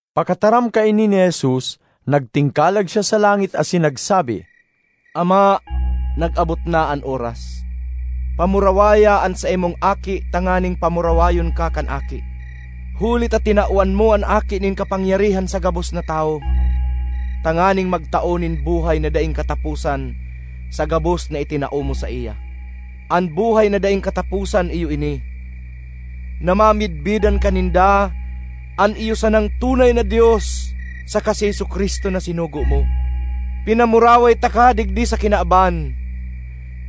Pakataram kaini ni Jesus, nagtingkalag siya sa langit asin nagsabi, “Ama, nag-abot na an oras. Pamurawaya an saimong Aki tanganing pamurawayon ka kan Aki. Huli ta tinawan mo an Aki nin kapangyarihan sa gabos na tawo, tanganing magtao nin buhay na daing kataposan sa gabos na itinao mo saiya. An buhay na daing kataposan iyo ini: na mamidbidan ka ninda, an iyo sanang tunay na Dios, saka si Jesu-Cristo na sinugo mo. Pinamuraway taka digdi sa kinaban;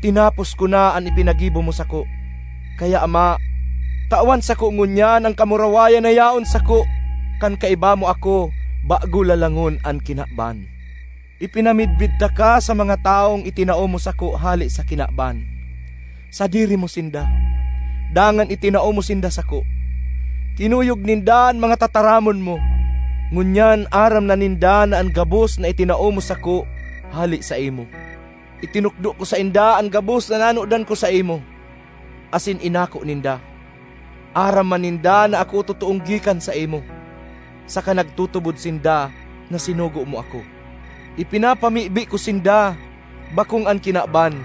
tinapos ko na an ipinagibo mo sako. Kaya, Ama, tawan sako ngunyan an kamurawayan na yaon sako kan kaiba mo ako bago lalangon an kinaban. ”Ipinamidbid taka sa mga tawong itinao mo sako hale sa kinaban. Sadiri mo sinda, dangan itinao mo sinda sako. Kinuyog ninda an mga tataramon mo; ngunyan aram na ninda na an gabos na itinao mo sako hale saimo. Itinukdo ko sainda an gabos na nanodan ko saimo, asin inako ninda. Aram man ninda na ako totoong gikan saimo, saka nagtutubod sinda na sinugo mo ako. ”Ipinapamibi ko sinda, bakong an kinaban,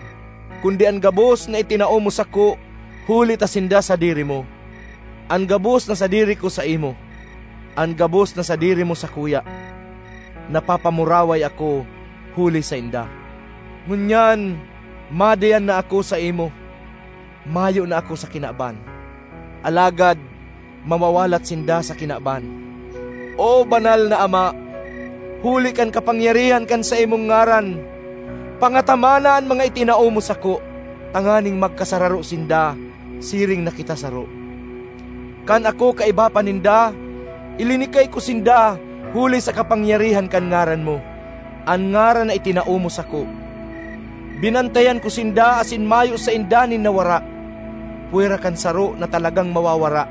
kundi an gabos na itinao mo sako huli ta sinda sadiri mo. An gabos na sadiri ko saimo, an gabos na sadiri mo sakuya; napapamuraway ako huli sainda. Ngunyan madiyan na ako saimo; mayo na ako sa kinaban, alagad mawawalat sinda sa kinaban. O Banal na Ama, huli kan kapangyarihan kan saimong ngaran, pangatamana an mga itinao mo sako, tanganing magkasararo sinda siring na kita saro. Kan ako kaiba pa ninda, ilinikay ko sinda huli sa kapangyarihan kan ngaran mo, an ngaran na itinao mo sako. Binantayan ko sinda asin mayo sainda nin nawara, pwera kan saro na talagang mawawara,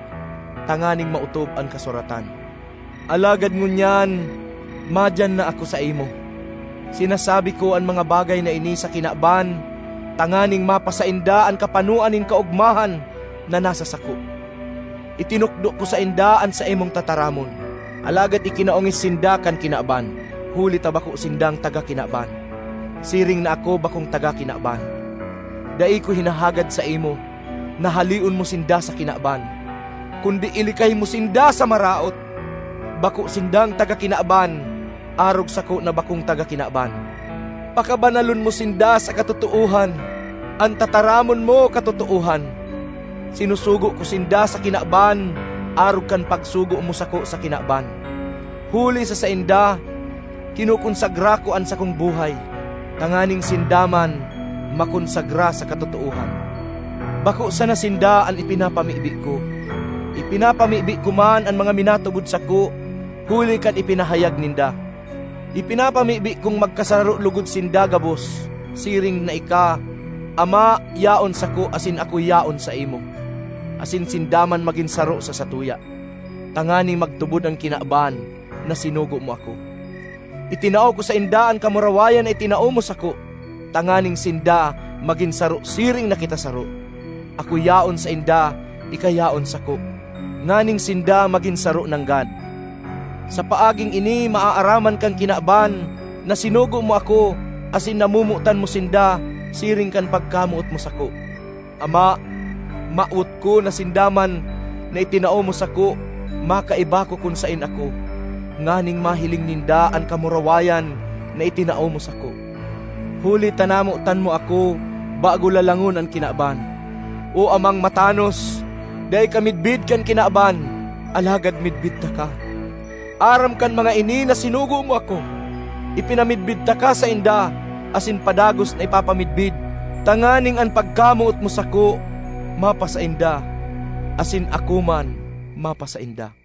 tanganing maotob an kasuratan. Alagad ngunyan madiyan na ako saimo; sinasabi ko an mga bagay na ini sa kinaban tanganing mapasainda an kapanoan nin kaogmahan na nasa sako. Itinukdo ko sainda an saimong tataramon, alagad ikinaongis sinda kan kinaban, huli ta bako sindang taga kinaban, siring na ako bakong taga kinaban. Dai ko hinahagad saimo na haleon mo sinda sa kinaban, kundi ilikay mo sinda sa Maraot. Bako sindang taga kinaban, arog sako na bakong taga kinaban. Pakabanalon mo sinda sa katotoohan; an tataramon mo katotoohan. Sinusugo ko sinda sa kinaban arog kan pagsugo mo sako sa kinaban. Huli sa sainda, kinokonsagra ko an sakong buhay, tanganing sinda man makonsagra sa katotoohan. ”Bako sana sinda an ipinapamibi ko; ipinapamibi ko man an mga minatubod sako huli kan ipinahayag ninda. Ipinapamibi kong magkasararo logod sinda gabos; siring na ika, Ama, yaon sako asin ako yaon saimo, asin sinda man magin saro sa satuya, tanganing magtubod an kinaban na sinugo mo ako. Itinao ko sainda an kamurawayan na itinao mo sako, tanganing sinda magin saro siring na kita saro; ako yaon sainda, ika yaon sako, nganing sinda magin saro nanggad. Sa paaging ini maaaraman kan kinaban na sinugo mo ako asin namomotan mo sinda siring kan pagkamoot mo sako. ”Ama, mawot ko na sinda man na itinao mo sako makaiba ko kun saen ako, nganing mahiling ninda an kamurawayan na itinao mo sako; huli ta namotan mo ako bago lalangon an kinaban. O Amang matanos, dai ka midbid kan kinaban, alagad midbid taka; aram kan mga ini na sinugo mo ako. Ipinamidbid taka sainda asin padagos na ipapamidbid, tanganing an pagkamoot mo sako mapasainda asin ako man mapasainda.”